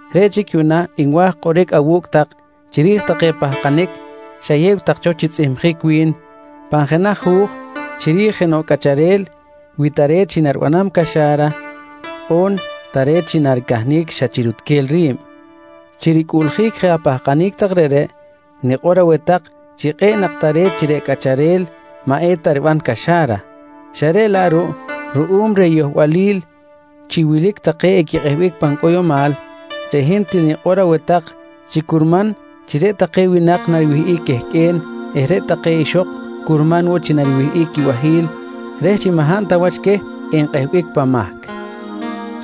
Reꞌ chic yuꞌna nwa̱j kꞌoric awu̱cꞌ tak chiri̱j take pahkanic xayew tak cho chi tzꞌihmjic wi̱n pan jenaj hu̱j chiri̱j jenoꞌ cꞌacharel wi tare̱t chi nariban caxa̱ra on tare̱t chi naricahnic xa chi rutquel ri̱b. Chi ricꞌuꞌljic je apahkanic tak reꞌreꞌ, nikꞌor aweh tak chi kꞌe̱ꞌ nak tare̱t chi reꞌ cꞌacharel maꞌ eta riban caxa̱ra, xa reꞌ laꞌ ruꞌ ruꞌum reh yohbalil chi wilic take equikꞌehbic pan cꞌoyomal, reꞌ hin til nikꞌor aweh tak chi curman chi reꞌ take winak nariwihꞌic quehqꞌue̱n eh reꞌ take ixok curman woꞌ chi nariwihꞌic quibahi̱l reh chi maꞌ hab ta wach queh enkꞌehbic pan mahc.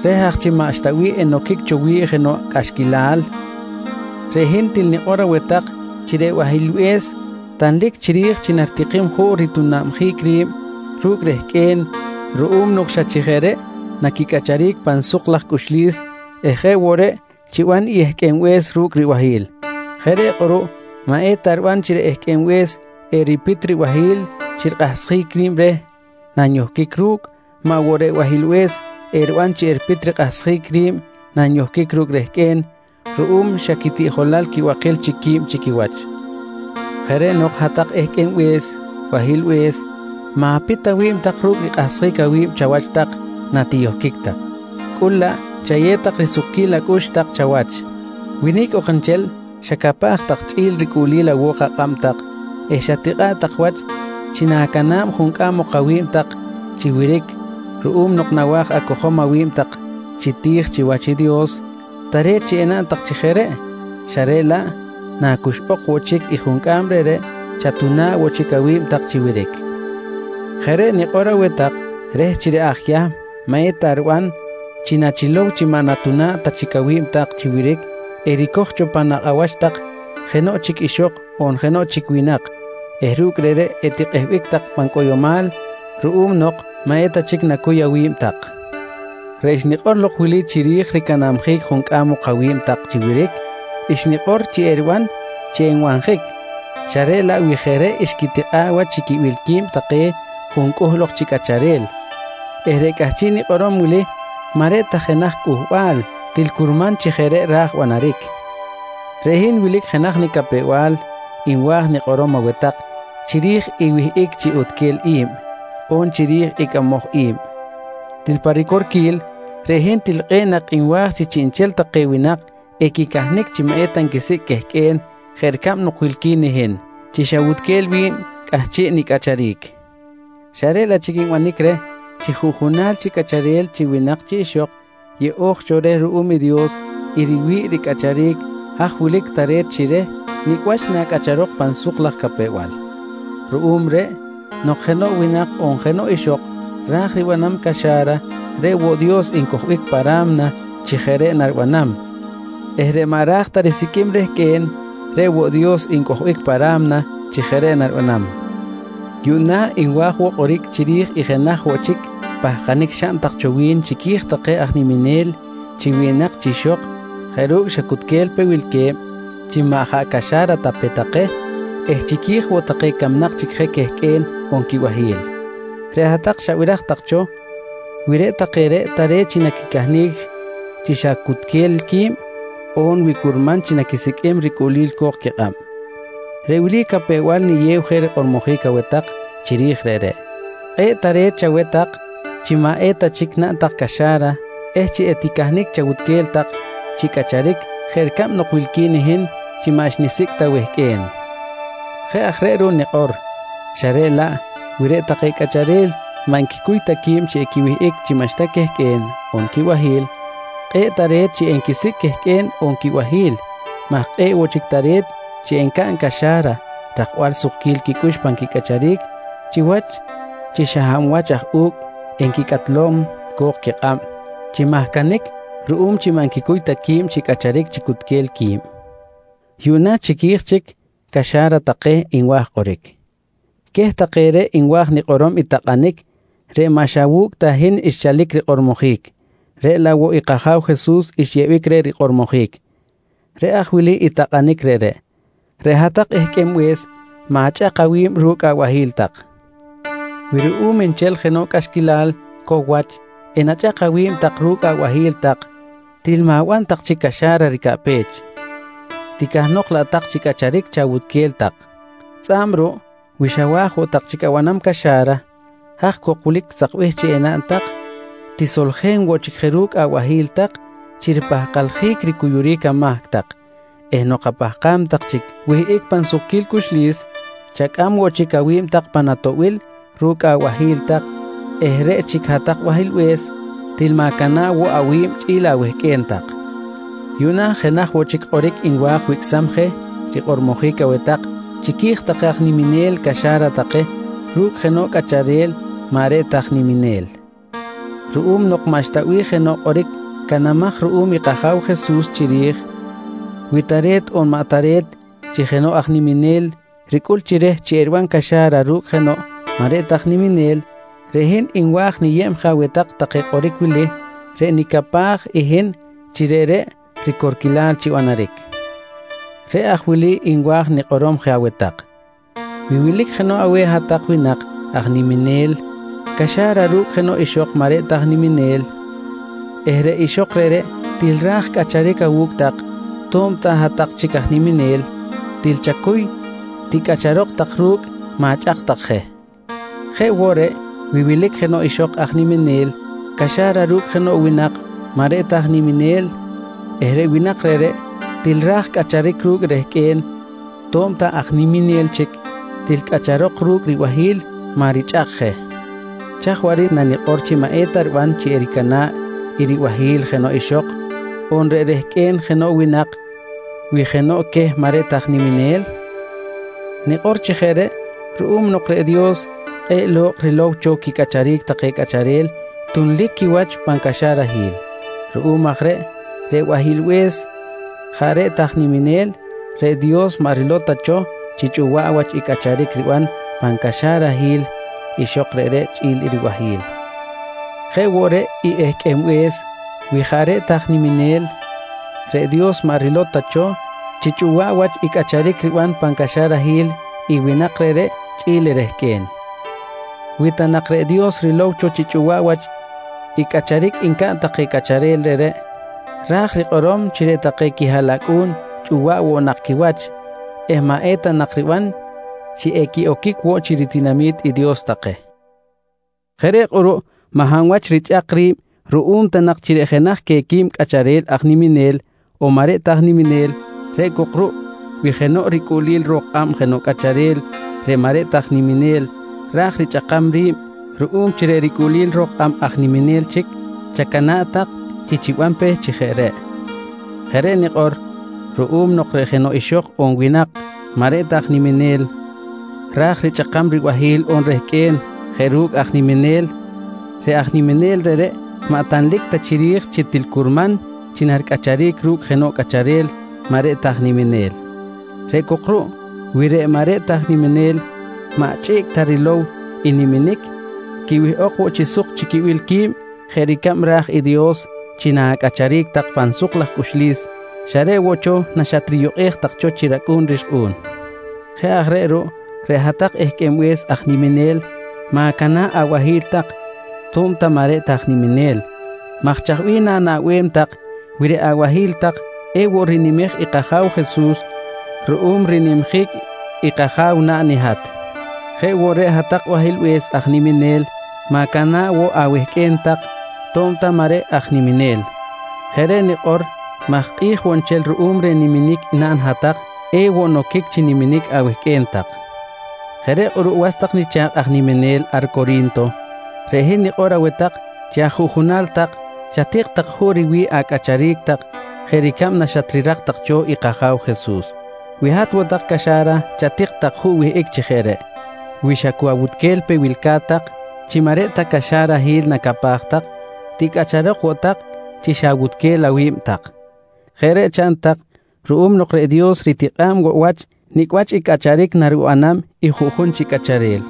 Reh aj chi maꞌxta bih enoquic cho wi̱ꞌ jenoꞌ cꞌaxquilal, reꞌ hin til nikꞌor aweh tak chi reꞌ bahilbe̱s tanlic chiri̱j chi naritikim juꞌ ritunabjic ri̱b ru̱cꞌ rehqꞌue̱n ruꞌum nok xa chi jeꞌ reꞌ naquicꞌacharic pan suk laj cꞌuxlis eh jeꞌ woꞌ reꞌ chiban i ehqꞌuenbe̱s ru̱cꞌ ribahi̱l. Jeꞌ reꞌ kꞌuruꞌ maꞌ eta riban chi reꞌ ehqꞌuenbe̱s eripit ribahi̱l chi rikꞌahsjic ri̱b reh nanyohquic ru̱cꞌ, maꞌ woꞌ reꞌ bahilbe̱s eriban chi eripit rikꞌahsjic ri̱b nanyohquic ru̱cꞌ rehqꞌue̱n ruꞌum chi xa quitiꞌjolal quibakil chic qui̱b chi quiwach. Jeꞌ reꞌ nok hat-tak ehqꞌuenbe̱s bahilbe̱s, ma̱pit tak awi̱b ru̱cꞌ rikꞌahsjic awi̱b tak chawach natiyohquic tak, cꞌul laꞌ chayew tak risukquil acꞌux tak chawach. Wi nicꞌ ok nchel xacapaj tak chꞌi̱l ricꞌuꞌlil awo̱k akꞌab tak eh xatikꞌa̱ꞌ tak wach chi na̱cana̱b juncꞌam ok awi̱b tak chi wiric ruꞌum nok nawa̱j acojom awi̱b tak chi ti̱j chiwach i Dios, tare̱t chi enaꞌn tak chi jeꞌ reꞌ, xa reꞌ laꞌ nacuxꞌok woꞌ chic i juncꞌam reꞌreꞌ chatuna̱ꞌ woꞌ chic awi̱b tak chi wiric. Jeꞌ reꞌ nikꞌor aweh tak reh chi reꞌ aj Yahm maꞌ eta riban chi nachilow chi maꞌ natuna̱ꞌ ta chic awi̱b tak chi wiric ericoj cho pan nakꞌ awach tak jenoꞌ chic ixok on jenoꞌ chic winak eh ru̱cꞌ reꞌreꞌ etikꞌehbic tak pan cꞌoyomal ruꞌum nok maꞌ eta chic nacuy awi̱b tak. Reꞌ xnikꞌor lok wili chiri̱j ricanabjic juncꞌam ok awi̱b tak chi wiric, xnikꞌor chi eriban chi enbanjic xa reꞌ laꞌ wi jeꞌ reꞌ xquitikꞌa̱ꞌ wach chi quibil qui̱b take juncꞌuhl ok chi cꞌacharel eh reꞌ cꞌahchiꞌ nikꞌorom wili maꞌ reꞌ ta jenaj cꞌuhbal til curman chi jeꞌ reꞌ ra̱j banaric. Reꞌ hin wilic jenaj nicapew-bal nwa̱j nikꞌorom aweh tak chiri̱j i wihꞌic chi utquel i̱b on chiri̱j i cꞌamoj i̱b. Til pa ricorquil reꞌ hin til kꞌe̱ꞌ nak nwa̱j chi chiꞌnchel take winak equicahnic chi maꞌ eta nquisicꞌ quehqꞌue̱n jeꞌ ricab nok wilqui̱n i hin chi xawutquel wi̱b cꞌahchiꞌ nicꞌacharic, xa reꞌ laꞌ chic nbanic reh chi juꞌjunal chi cꞌacharel chi winak chi ixok yeꞌo̱j cho reh ruꞌum i Dios i riwi̱ꞌ ricꞌacharic haj wilic tare̱t chi reh nicꞌ wach nacꞌacharok pan suk laj capew-bal. Ruꞌum reꞌ, nok jenoꞌ winak on jenoꞌ ixok ra̱j ribanam caxa̱ra reꞌ woꞌ Dios ncojbic pa ra̱mna chi jeꞌ reꞌ naribanam eh reꞌ maꞌ ra̱j ta risiqꞌuim rehqꞌue̱n reꞌ woꞌ Dios ncojbic pa ra̱mna chi jeꞌ reꞌ naribanam. Yuꞌna nwa̱j woꞌ kꞌoric chiri̱j i jenaj woꞌ chic pahkanic xaꞌn tak cho wi̱n chiqui̱j take aj niminel chi winak chi ixok jeꞌ ru̱cꞌ xa cu cutquel pe wilque̱b chi maꞌ jaꞌ caxa̱ra ta pe take eh chiqui̱j woꞌ take camnak chic je quehqꞌue̱n on quibahi̱l. Reꞌ hat-tak xabiraj tak cho wi reꞌ take reꞌ tare̱t chi naquicahnic chi xa cutquel qui̱b on wi curman chi naquisiqꞌuim ricꞌuꞌlil co̱k quikꞌab. Reꞌ wili capew-bal niyew je rikꞌormojic aweh tak chiri̱j reꞌreꞌ: Kꞌe̱ꞌ tare̱t chaweh tak chi maꞌ eta chic naꞌn tak caxa̱ra eh chi eticahnic tak chawutquel tak chi cꞌacharic jeꞌ ricab nok wilqui̱n i hin chi maꞌ xnisicꞌ ta wehqꞌue̱n. Jeꞌ aj reꞌ ruꞌ nikꞌor xa reꞌ laꞌ wi reꞌ take cꞌacharel maꞌ nquicuy ta qui̱b chi equiwihꞌic chi maꞌxta quehqꞌue̱n on quibahi̱l, kꞌe̱ꞌ tare̱t chi enquisicꞌ quehqꞌue̱n on quibahi̱l maj kꞌe̱ꞌ woꞌ chic tare̱t chi encaꞌn caxa̱ra rakbal sukquil quicꞌux pan quicꞌacharic chiwach chi xa hab wach aj u̱cꞌ enquicꞌatlom co̱k quikꞌab chi mahcanic ruꞌum chi maꞌ nquicuy ta qui̱b chi cꞌacharic chi cutquel qui̱b. Yuꞌna chiqui̱j chic caxa̱ra take nwa̱j kꞌoric. Queh take reꞌ nwa̱j nikꞌorom i takꞌanic reꞌ maꞌ xa wu̱cꞌ ta hin xchalic rikꞌormojic, reꞌ laꞌ woꞌ i kAja̱w Jesus xyeꞌbic reh rikꞌormojic. Reꞌ aj wili i takꞌanic reꞌreꞌ: Reꞌ hat-tak ehqꞌuenbe̱s ma̱chꞌak awi̱b ru̱cꞌ abahi̱l tak. Wi ruꞌum nchel jenoꞌ cꞌaxquilal cow wach enachꞌak awi̱b tak ru̱cꞌ abahi̱l tak, til ma̱ban tak chic caxa̱ra ricaꞌpech, ticahnok laꞌ tak chi cꞌacharic chawutquel tak. Tzꞌa̱b ruꞌ wi xawa̱j woꞌ tak chic abanam caxa̱ra, haj cok wilic sakbih chi enaꞌn tak: Tisoljen woꞌ chic je ru̱cꞌ abahi̱l tak chi ripahkaljic ricuyuric amahc tak eh nok apahkam tak chic wihꞌic pan sukquil cꞌuxlis, chacꞌam woꞌ chic awi̱b tak pan atoꞌbil ru̱cꞌ abahi̱l tak eh reꞌ chic hat-tak bahilbe̱s, til ma̱cana̱ꞌ woꞌ awi̱b chꞌi̱l awehqꞌue̱n tak. Yuꞌna jenaj woꞌ chic kꞌoric nwa̱j wicꞌsam je rikꞌormojic aweh tak chiqui̱j take aj niminel caxa̱ra take ru̱cꞌ jenoꞌ cꞌacharel maꞌ reꞌ ta aj niminel. Ruꞌum nok maꞌxta bih jenoꞌ kꞌoric canamaj ruꞌum i kAja̱w Jesus chiri̱j, wi tare̱t on maꞌ tare̱t chi jenoꞌ aj niminel ricꞌul chi reh chi eriban caxa̱ra ru̱cꞌ jenoꞌ maꞌ reꞌ ta aj niminel, reꞌ hin nwa̱j niyeb je aweh tak take kꞌoric wili reꞌ nicapaj i hin chi reꞌreꞌ ricorquilal chi banaric. Reꞌ aj wili nwa̱j nikꞌorom je aweh tak: Wi wilic jenoꞌ aweh hat-tak winak aj niminel caxa̱ra ru̱cꞌ jenoꞌ ixok maꞌ reꞌ ta aj niminel eh reꞌ ixok reꞌreꞌ til ra̱j cꞌacharic awu̱cꞌ tak to̱b ta hat-tak chic aj niminel, til chacuy ticꞌacharok tak ru̱cꞌ, ma̱chꞌak tak je. Jeꞌ woꞌ reꞌ wi wilic jenoꞌ ixok aj niminel caxa̱ra ru̱cꞌ jenoꞌ winak maꞌ reꞌ ta aj niminel eh reꞌ winak reꞌreꞌ til ra̱j cꞌacharic ru̱cꞌ i rehqꞌue̱n to̱b ta aj niminel chic, til cꞌacharok ru̱cꞌ ribahi̱l maꞌ richꞌak je. Chaj waꞌric nanikꞌor chi maꞌ eta riban chi ericana̱ꞌ i ribahi̱l jenoꞌ ixok on reꞌ rehqꞌue̱n jenoꞌ winak wi jenoꞌ queh maꞌ reꞌ ta aj niminel? Nikꞌor chi jeꞌ reꞌ ruꞌum nok reꞌ Dios kꞌe̱ꞌ lo̱kꞌ rilow cho quicꞌacharic take cꞌacharel tunlic quiwach pan caxarahil. Ruꞌum aj reꞌ wi reꞌ bahilbe̱s jaꞌ reꞌ ta aj niminel, reꞌ Dios maꞌ rilow ta cho chi chꞌuwaꞌ wach i cꞌacharic riban pan caxarahil ixok reꞌreꞌ chꞌi̱l i ribahi̱l. Jeꞌ woꞌ reꞌ i ehqꞌuenbe̱s wi jaꞌ reꞌ ta aj niminel, reꞌ Dios maꞌ rilow ta cho chi chꞌuwaꞌ wach i cꞌacharic riban pan caxarahil i winak reꞌreꞌ chꞌi̱l i rehqꞌue̱n. Wi ta nak reꞌ Dios rilow cho chi chꞌuwaꞌ wach i cꞌacharic ncaꞌn take cꞌacharel reꞌreꞌ, ra̱j rikꞌorom chi reꞌ take quihaꞌlacꞌu̱n chꞌuwaꞌ woꞌ nak quiwach eh maꞌ eta nak riban chi equiꞌoquic woꞌ chi ritinami̱t i Dios take. Jeꞌ reꞌ kꞌuruꞌ maꞌ hab wach richꞌak ri̱b ruꞌum ta nak chi reꞌ jenaj queh quib cꞌacharel aj niminel on maꞌ reꞌ ta aj niminel, reꞌ cok ruꞌ wi jenoꞌ ricꞌuꞌlil ro̱k kꞌab jenoꞌ cꞌacharel reꞌ maꞌ reꞌ ta aj niminel ra̱j richꞌakam ri̱b ruꞌum chi reꞌ ricꞌuꞌlil ro̱k kꞌab aj niminel chic, chacana̱ꞌ tak chi chiban pe chi jeꞌ reꞌ. Jeꞌ reꞌ nikꞌor ruꞌum nok reꞌ jenoꞌ ixok on winak maꞌ reꞌ ta aj niminel ra̱j richꞌakam i ribahi̱l on rehqꞌue̱n jeꞌ ru̱cꞌ aj niminel, reꞌ aj niminel reꞌreꞌ maꞌ tanlic ta chiri̱j chi til curman chi naricꞌacharic ru̱cꞌ jenoꞌ cꞌacharel maꞌ reꞌ ta aj niminel. Reꞌ cok ruꞌ wi reꞌ maꞌ reꞌ ta aj niminel maꞌ chꞌiꞌc tak rilow i niminic, quiwihꞌok woꞌ chi suk chi quibil qui̱b jeꞌ ricab ra̱j i Dios chi na̱cꞌacharic tak pan suk laj cꞌuxlis xa reꞌ woꞌ cho naxatriyukꞌej tak cho chi racꞌu̱n rixkꞌu̱n. Jeꞌ aj reꞌ ruꞌ reꞌ hat-tak ehqꞌuenbe̱s aj niminel ma̱cana̱ꞌ abahi̱l tak, to̱b ta maꞌ reꞌ aj niminel maj chaj bih na̱naꞌbem tak wi reꞌ abahi̱l tak ewoꞌ rinimej i kAja̱w Jesus ruꞌum rinimjic i kAja̱w naꞌn i hat. Jeꞌ woꞌ reꞌ hat-tak bahilbe̱s aj niminel ma̱cana̱ꞌ woꞌ awehqꞌue̱n tak, to̱b ta maꞌ reꞌ aj niminel. Jeꞌ reꞌ nikꞌor maj kꞌi̱j woꞌ nchel ruꞌum reh niminic naꞌn i hat-tak ewoꞌ noquic chi niminic awehqꞌue̱n tak. Jeꞌ reꞌ kꞌuruꞌ was tak nicha̱kꞌ aj niminel ar Cori̱nto, reꞌ hin nikꞌor aweh tak chi ajuꞌjunal tak chatik tak juꞌ riwi̱ꞌ acꞌacharic tak jeꞌ ricab naxatrirak tak cho i kAja̱w Jesus. Wi hat woꞌ tak caxa̱ra, chatik tak juꞌ wihꞌic chi jeꞌ reꞌ. Wi xa cu awutquel pe wilca̱t tak chi maꞌ reꞌ ta caxarahil nacapaj tak, ticꞌacharok woꞌ tak chi xa chawutquel awi̱b tak. Jeꞌ reꞌ chaꞌn tak ruꞌum nok reꞌ Dios ritikꞌa̱b woꞌ wach nicꞌ wach i cꞌacharic naribanam i juꞌjun chi cꞌacharel.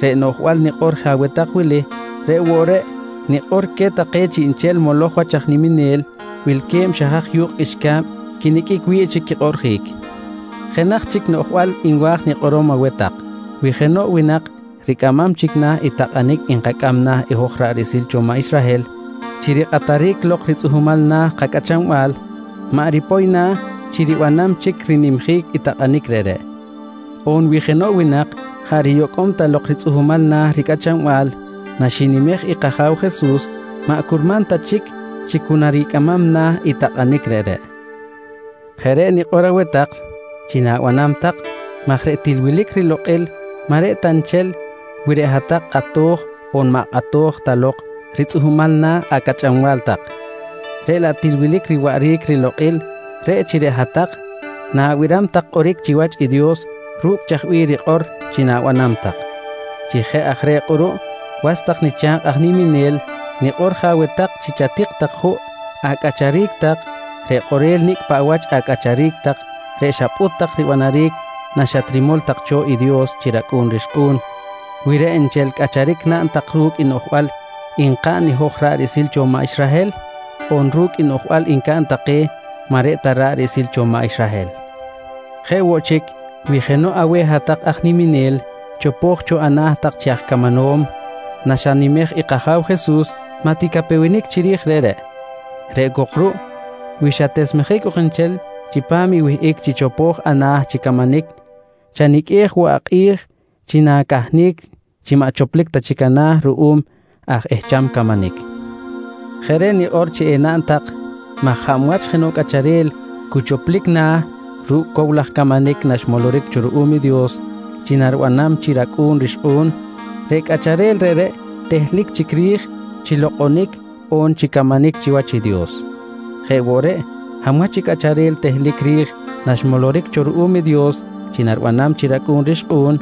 Reꞌ noꞌjbal nikꞌor je aweh tak wili, reꞌ woꞌ reꞌ nikꞌor queh take chiꞌnchel moloj wach aj niminel wilque̱b xa haj yu̱kꞌ qꞌuixca̱b quiniqꞌuic wi̱ꞌ chi quikꞌoꞌrjic. Jenaj chic noꞌjbal nwa̱j nikꞌorom aweh tak. Wi jenoꞌ winak ricꞌamam chic na̱ i takꞌanic nkacꞌam na̱ i hoj ra̱ꞌ riꞌsil cho maꞌ Israhel chi rikꞌataric lok ritzꞌuhmal na̱ kacꞌachanbal, maꞌ ripoy na̱ chi ribanam chic rinimjic i takꞌanic reꞌreꞌ. On wi jenoꞌ winak jaꞌ riyocꞌ ta lok ritzꞌuhmal na̱ ricꞌachanbal naxinimej i kAja̱w Jesus, maꞌ curman ta chic chi cu naricꞌamam na̱ i takꞌanic reꞌreꞌ. Jeꞌ reꞌ nikꞌor aweh tak chi na̱banam tak maj reꞌ til wilic rilokꞌil maꞌ reꞌ ta nchel wi reꞌ hat-tak kꞌato̱j on maꞌ kꞌato̱j ta lok ritzꞌuhmal na̱ acꞌachanbal tak, reꞌ laꞌ til wilic riwaꞌric rilokꞌil reꞌ chi reꞌ hat-tak na̱biram tak kꞌoric chiwach i Dios ru̱cꞌ chaj bih rikꞌor chi na̱banam tak. Chi jeꞌ aj reꞌ kꞌuruꞌ was tak nicha̱kꞌ aj niminel nikꞌor je aweh tak chi chatik tak juꞌ acꞌacharic tak reꞌ kꞌorel nicꞌ paꞌ wach acꞌacharic tak reꞌ xapꞌut tak ribanaric naxatrimol tak cho i Dios chi racꞌu̱n rixkꞌu̱n, wi reꞌ nchel cꞌacharic naꞌn tak ru̱cꞌ i noꞌjbal nkaꞌn i hoj ra̱ꞌ riꞌsil cho maꞌ Israhel on ru̱cꞌ i noꞌjbal ncaꞌn take maꞌ reꞌ ta ra̱ꞌ riꞌsil cho maꞌ Israhel. Jeꞌ woꞌ chic, wi jenoꞌ aweh hat-tak aj niminel chopo̱j cho ana̱ tak chi aj camanom naxanimej i kAja̱w Jesus, maꞌ ticapewenic chiri̱j reꞌreꞌ. Reꞌ cok ruꞌ wi xatesmejic ok nchel chipam i wihꞌic chi chopo̱j ana̱ chi camanic, chaniqꞌuej woꞌ akꞌi̱j chi na̱cahnic chi maꞌ choplic ta chic ana̱ ruꞌum aj ehcham camanic. Jeꞌ reꞌ nikꞌor chi enaꞌn tak maj hab wach jenoꞌ cꞌacharel cu choplic na̱ ru̱cꞌ cow laj camanic naxmoloric cho ruꞌum i Dios chi naribanam chi racꞌu̱n rixkꞌu̱n, reꞌ cꞌacharel reꞌreꞌ tehlic chic ri̱j chi lokꞌonic on chi camanic chiwach i Dios. Jeꞌ woꞌ reꞌ, hab wach i cꞌacharel tehlic ri̱j naxmoloric cho ruꞌum i Dios chi naribanam chi racꞌu̱n rixkꞌu̱n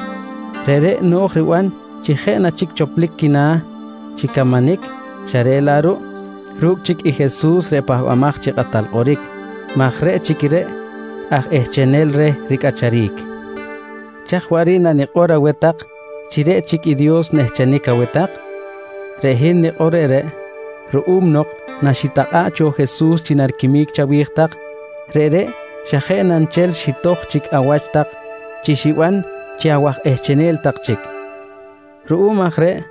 reꞌreꞌ no̱j riban chi jeꞌ na chic choplic quina̱ chi camanic xa reꞌ laꞌ ruꞌ ru̱cꞌ chic i Jesus reꞌ Pahbamaj chi Kꞌatal Kꞌoric maj reꞌ chic reꞌ aj ehchenel reh ricꞌacharic. Chaj waꞌric nanikꞌor aweh tak chi reꞌ chic i Dios nehchenic aweh tak? Reꞌ hin nikꞌor reꞌreꞌ ruꞌum nok naxitakꞌa̱ꞌ cho Jesus chi nariquimic chawi̱j tak, reꞌreꞌ xa jeꞌ na nchel xitoj chic awach tak chi xiban chi awaj ehchenel tak chic. Ruꞌum aj reꞌ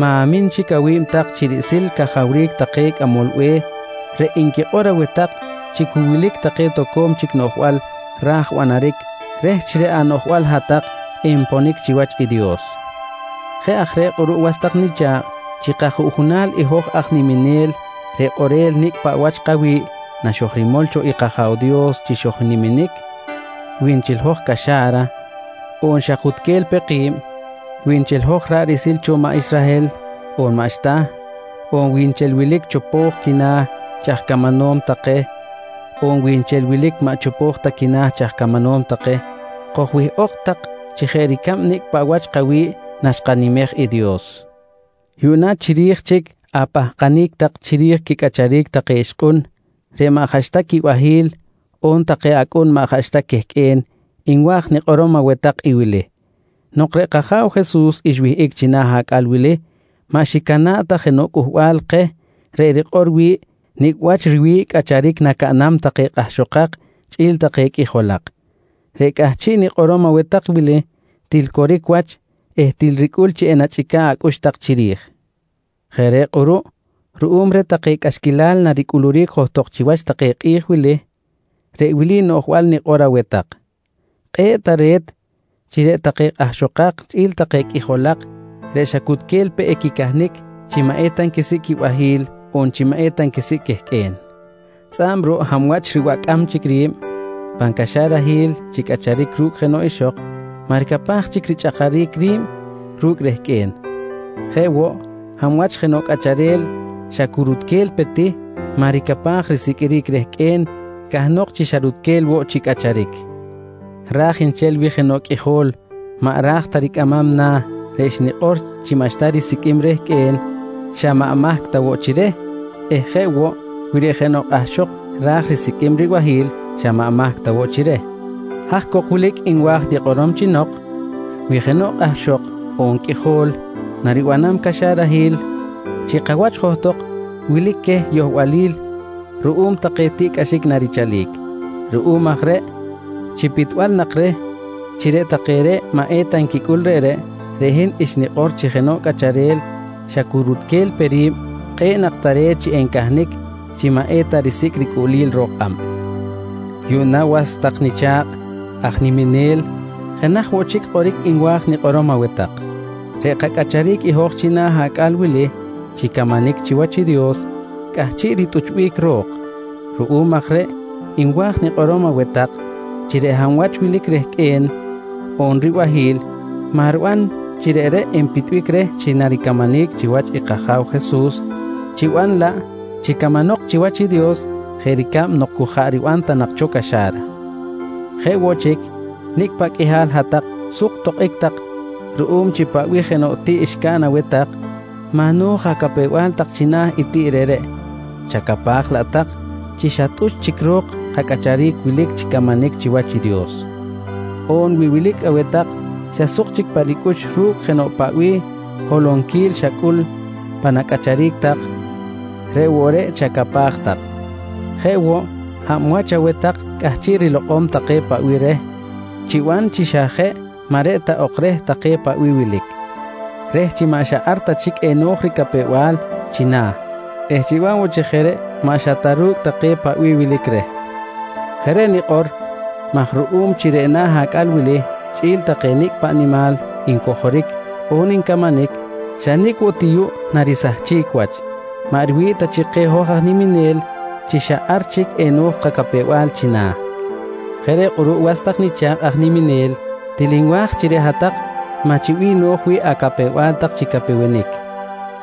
ma̱min chic awi̱b tak chi riꞌsil cajawric take aj cꞌamol be̱h reꞌ nquikꞌor aweh tak chi cu wilic take toco̱m chic noꞌjbal raj banaric reh chi reꞌ anoꞌjbal hat-tak enponic chiwach i Dios. Jeꞌ aj reꞌ kꞌuruꞌ was tak nicha̱kꞌ chi kajuꞌjunal i hoj aj niminel reꞌ kꞌorel nicꞌ paꞌ wach kawi̱ꞌ naxojrimol cho i kAja̱w Dios chi xojniminic, wi nchel hoj caxa̱ra on xa kutquel peꞌ ki̱b, wi nchel hoj ra̱ꞌ riꞌsil cho maꞌ Israhel on maꞌxta. On wi nchel wilic keh chopo̱j quina̱ chi aj camanom take on wi nchel wilic maꞌ chopo̱j ta quina̱ chi aj camanom take, kojwihꞌok tak chi jeꞌ ricab nicꞌ paꞌ wach kawi̱ꞌ naxkanimej i Dios. Yuꞌna chiri̱j chic apahkanic tak chiri̱j quicꞌacharic take ixkꞌun reꞌ maꞌ jaꞌxta quibahi̱l on take acꞌun maꞌ jaꞌxta quehqꞌue̱n nwa̱j nikꞌorom aweh tak i wili: Nok reꞌ kAja̱w Jesus xwihꞌic china̱ acꞌal wili maꞌ xicana̱ꞌ ta jenoꞌ cꞌuhbal keh reꞌ rikꞌor wi̱ꞌ nicꞌ wach riwi̱ꞌ cꞌacharic nacaꞌnam take kꞌahxokak chꞌi̱l take qꞌuijolak. Reꞌ cꞌahchiꞌ nikꞌorom aweh tak wili til coric wach eh til ricꞌul chi enachꞌica̱ꞌ acꞌux tak chiri̱j. Jeꞌ reꞌ kꞌuruꞌ ruꞌum reh take cꞌaxquilal naricꞌuluric johtok chiwach take kꞌi̱j wili, reꞌ wili noꞌjbal nikꞌor aweh tak: Kꞌe̱ꞌ tare̱t chi reꞌ take kꞌahxokak chꞌi̱l take qꞌuijolak reꞌ xa cu cutquel pe equicahnic chi maꞌ eta nquisicꞌ quibahi̱l on chi maꞌ eta nquisicꞌ quehqꞌue̱n. Tzꞌa̱b ruꞌ hab wach ribacꞌam chic ri̱b pan caxarahil chi cꞌacharic ru̱cꞌ jenoꞌ ixok, maꞌ ricapaj chic richꞌakaric ri̱b ru̱cꞌ rehqꞌue̱n. Jeꞌ woꞌ, hab wach jenoꞌ cꞌacharel xa cu rutquel pe ti maꞌ ricapaj risiqꞌuiric rehqꞌue̱n, cahnok chi xa rutquel woꞌ chi cꞌacharic. Raj nchel wi jenoꞌ qꞌuijol maꞌ raj ta ricꞌamam na̱ reꞌ xnikꞌor chi maꞌxta risiqꞌuim rehqꞌue̱n xa maꞌ mahc ta woꞌ chi reh eh jeꞌ woꞌ, wi reꞌ jenoꞌ kꞌahxok ra̱j risiqꞌuim ribahi̱l xa maꞌ mahc ta woꞌ chi reh. Haj cok wilic nwa̱j nikꞌorom chi nok: Wi jenoꞌ kꞌahxok on qꞌuijol naribanam caxarahil, chi kawach johtok wilic queh yohbalil ruꞌum take tiꞌcꞌaxic narichalic. Ruꞌum aj reꞌ chi pitbal nak reh chi reꞌ take reꞌ maꞌ eta nquicꞌul reꞌreꞌ, reꞌ hin xnikꞌor chi jenoꞌ cꞌacharel xa cu rutquel pe ri̱b, kꞌe̱ꞌ nak tare̱t chi encahnic chi maꞌ eta risicꞌ ricꞌuꞌlil ro̱k kꞌab. Yuꞌna was tak nicha̱kꞌ aj niminel jenaj woꞌ chic kꞌoric nwa̱j nikꞌorom aweh tak: Reꞌ kacꞌacharic i hoj china̱ acꞌal wili chi camanic chiwach i Dios cꞌahchiꞌ ritꞌuchbic ro̱k. Ruꞌum aj reꞌ nwa̱j nikꞌorom aweh tak chi reꞌ hab wach wilic rehqꞌue̱n on ribahi̱l maꞌ riban chi reꞌreꞌ enpitbic reh chi naricamanic chiwach i kAja̱w Jesus, chiban laꞌ chi camanok chiwach i Dios jeꞌ ricab nok cu jaꞌ riban ta nak cho caxa̱ra. Jeꞌ woꞌ chic nicꞌ paꞌ qꞌuihal hat-tak suk tokꞌic tak ruꞌum chi paꞌ bih jenoꞌ tiꞌ xcaꞌn aweh tak maꞌ no̱j acapew-bal tak china̱ i tiꞌ reꞌreꞌ, chacapaj laꞌ tak chi xa tꞌuch chic ro̱k kacꞌacharic wilic chi camanic chiwach i Dios. On wi wilic aweh tak xa suk chic pa ricꞌux ru̱cꞌ jenoꞌ paꞌ bih holonquil xacꞌul pan acꞌacharic tak reꞌ woꞌ reꞌ chacapaj tak. Jeꞌ woꞌ, hab wach aweh tak cꞌahchiꞌ rilokꞌom take paꞌ bih reh chiban chi xa jeꞌ maꞌ reꞌ ta ok reh take paꞌ bih wilic, reh chi maꞌ xa ar ta chic eno̱j ricapew-bal china̱ eh chiban woꞌ chi jeꞌ maꞌxta ru̱cꞌ take paꞌ bih wilic reh. Jeꞌ reꞌ nikꞌor maj ruꞌum chi reꞌ na̱ acꞌal wili chꞌi̱l take nicꞌ paꞌ nimal ncojoric on ncamanic xa nicꞌ woꞌ ti yuꞌ narisahchic wach maꞌ riwi̱ꞌ ta chi keh hoj aj niminel chi xa ar chic eno̱j kacapew-bal china̱. Jeꞌ reꞌ kꞌuruꞌ was tak nicha̱kꞌ aj niminel, til nwa̱j chi reꞌ hat-tak maꞌ chi bih no̱j wi̱ꞌ acapew-bal tak chi capewenic.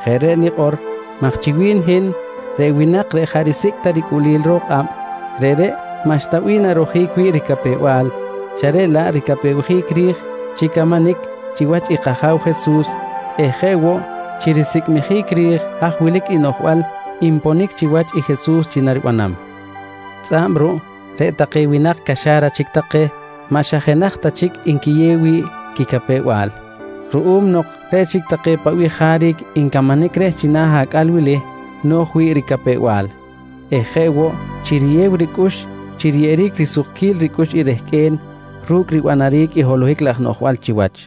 Jeꞌ reꞌ nikꞌor maj chi wi̱n hin reꞌ winak reꞌ jaꞌ risicꞌ ta ricꞌuꞌlil ro̱k kꞌab, reꞌreꞌ maꞌxta bih narojic wi̱ꞌ ricapew-bal xa reꞌ laꞌ ricapewjic ri̱j chi camanic chiwach i kAja̱w Jesus eh jeꞌ woꞌ chi risicꞌmijic ri̱j haj wilic i noꞌjbal nponic chiwach i Jesus chi naribanam. Tzꞌa̱b ruꞌ reꞌ take winak caxa̱ra chic take maꞌ xa jenaj ta chic nquiyew wi̱ꞌ quicapew-bal ruꞌum nok reꞌ chic take paꞌ bih jaric ncamanic reh china̱ acꞌal wili no̱j wi̱ꞌ ricapew-bal eh jeꞌ woꞌ chi riyew ricꞌux chi riyeꞌeric risukquil ricꞌux i rehqꞌue̱n ru̱cꞌ ribanaric holohic laj noꞌjbal chiwach.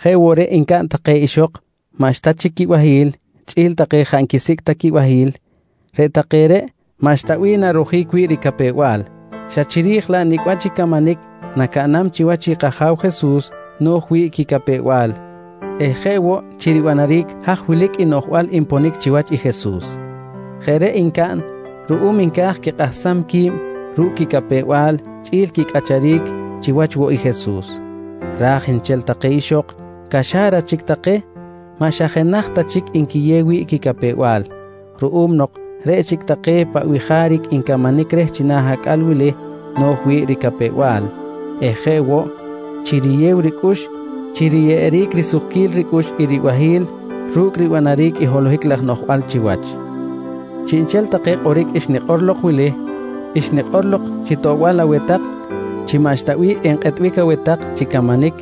Jeꞌ woꞌ reꞌ ncaꞌn take ixok maꞌxta chic quibahi̱l chꞌi̱l take jaꞌ nquisicꞌ ta quibahi̱l, reꞌ take reꞌ maꞌxta bih narojic wi̱ꞌ ricapew-bal xa chiri̱j laꞌ nicꞌ wach i camanic nacaꞌnam chiwach i kAja̱w Jesus no̱j wi̱ꞌ quicapew-bal eh jeꞌ woꞌ chi ribanaric haj wilic i noꞌjbal nponic chiwach i Jesus. Jeꞌ reꞌ ncaꞌn ruꞌum nca̱j quikꞌahsam qui̱b ru̱cꞌ quicapew-bal chꞌi̱l quicꞌacharic chiwach woꞌ i Jesus. Raj nchel take ixok caxa̱ra chic take maꞌ xa jenaj ta chic nquiyew wi̱ꞌ quicapew-bal ruꞌum nok reꞌ chic take paꞌ bih jaric ncamanic reh china̱ acꞌal wili no̱j wi̱ꞌ ricapew-bal eh jeꞌ woꞌ chi riyew ricꞌux chi riyeꞌeric risukquil ricꞌux i ribahi̱l ru̱cꞌ ribanaric holohic laj noꞌjbal chiwach. Chiꞌnchel take kꞌoric xnikꞌor lok wili, xnikꞌor lok chi toꞌbal aweh tak chi maꞌxta bih enkꞌetbic aweh tak chi camanic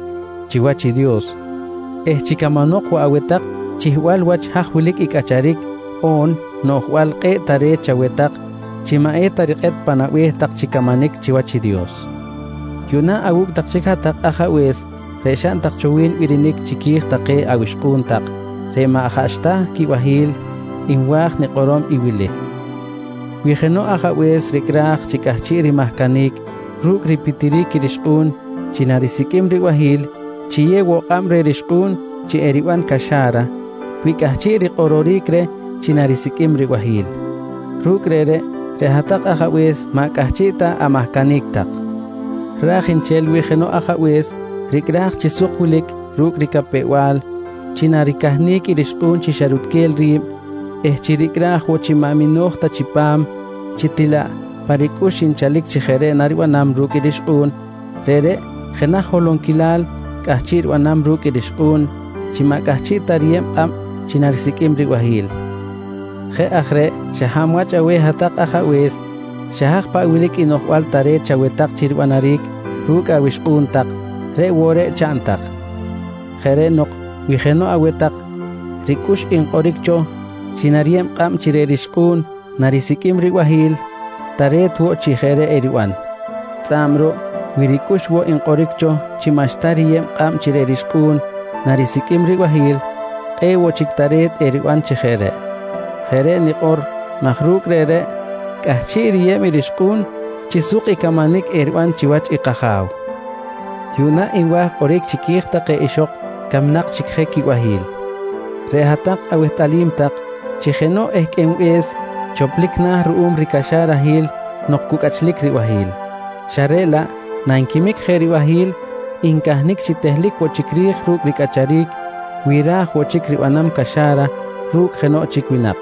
chiwach i Dios eh chi camanok woꞌ aweh tak chihbal wach haj wilic i cꞌacharic on noꞌjbal kꞌe̱ꞌ tare̱t chaweh tak chi maꞌ eta rikꞌet pan abe̱h tak chi camanic chiwach i Dios. Yuꞌna awu̱cꞌ tak chic hat-tak ajabe̱s reꞌ xaꞌn tak cho birinic chiqui̱j take awixkꞌu̱n tak reꞌ maꞌ jaꞌxta quibahi̱l nwa̱j nikꞌorom i wili: Wi jenoꞌ ajabe̱s ricꞌraj chi cꞌahchiꞌ rimahcanic ru̱cꞌ ripitiric i rixkꞌu̱n chi narisiqꞌuim ribahi̱l, chiyew woꞌ kꞌab reh rixkꞌu̱n chi eriban caxa̱ra wi cꞌahchiꞌ rikꞌororic reh chi narisiqꞌuim ribahi̱l. Ru̱cꞌ reꞌreꞌ, reꞌ hat-tak ajabe̱s maꞌ cꞌahchiꞌ ta amahcanic tak. Raj nchel wi jenoꞌ ajabe̱s ricꞌraj chi suk wilic ru̱cꞌ ricapew-bal chi naricahnic i rixkꞌu̱n chi xa rutquel ri̱b eh chi ricꞌraj woꞌ chi maꞌ mino̱j ta chipam chi til laꞌ pa ricꞌux nchalic chi jeꞌ reꞌ naribanam ru̱cꞌ i rixkꞌu̱n, reꞌreꞌ jenaj holonquilal cꞌahchiꞌ ribanam ru̱cꞌ i rixkꞌu̱n chi maꞌ cꞌahchiꞌ ta riyeb kꞌab chi narisiqꞌuim ribahi̱l. Jeꞌ aj reꞌ xa hab wach aweh hat-tak ajabe̱s, xa haj paꞌ wilic i noꞌjbal tare̱t chaweh tak chi banaric ru̱cꞌ awixkꞌu̱n tak reꞌ woꞌ reꞌ chaꞌn tak. Jeꞌ reꞌ nok wi jenoꞌ aweh tak ricꞌux nkꞌoric cho chi nariyeb kꞌab chi reꞌ rixkꞌu̱n narisiqꞌuim ribahi̱l, tare̱t woꞌ chi jeꞌ reꞌ eriban. Tzꞌa̱b ruꞌ wi ricꞌux woꞌ nkꞌoric cho chi maꞌxta riyeb kꞌab chi reꞌ rixkꞌu̱n narisiqꞌuim ribahi̱l, kꞌe̱ꞌ woꞌ chic tare̱t eriban chi jeꞌ reꞌ. Jeꞌ reꞌ nikꞌor maj ru̱cꞌ reꞌ reꞌreꞌ cꞌahchiꞌ riyeb i rixkꞌu̱n chi suk i camanic eriban chiwach i kAja̱w. Yuꞌna nwa̱j kꞌoric chiqui̱j take ixok camnak chic je quibahi̱l. Reꞌ hat-tak awehtꞌalim tak chi jenoꞌ ehqꞌuenbe̱s choplic na̱ ruꞌum ricaxarahil nok cu cꞌachlic ribahi̱l, xa reꞌ laꞌ nanquimic je ribahi̱l ncahnic chi tehlic woꞌ chic ri̱j ru̱cꞌ ricꞌacharic wi ra̱j woꞌ chic ribanam caxa̱ra ru̱cꞌ jenoꞌ chic winak.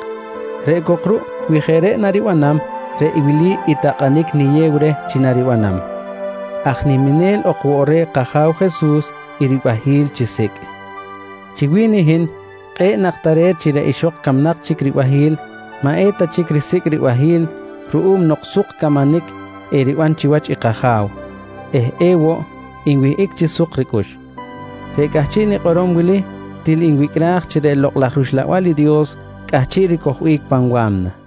Reꞌ cok ruꞌ wi jeꞌ reꞌ naribanam, reꞌ wili i takꞌanic niyew reh chi naribanam: Aj niminel ok woꞌ reh kAja̱w Jesus i ribahi̱l chisicꞌ. Chi wi̱n i hin kꞌe̱ꞌ nak tare̱t chi reꞌ ixok camnak chic ribahi̱l maꞌ eta chic risicꞌ ribahi̱l ruꞌum nok suk camanic eriban chiwach i kAja̱w eh ewoꞌ nwihꞌic chi suk ricꞌux. Reꞌ cꞌahchiꞌ nikꞌorom wili, til nwicꞌraj chi reꞌ Lokꞌ laj rUxlabal i Dios cꞌahchiꞌ ricojbic pan wa̱mna.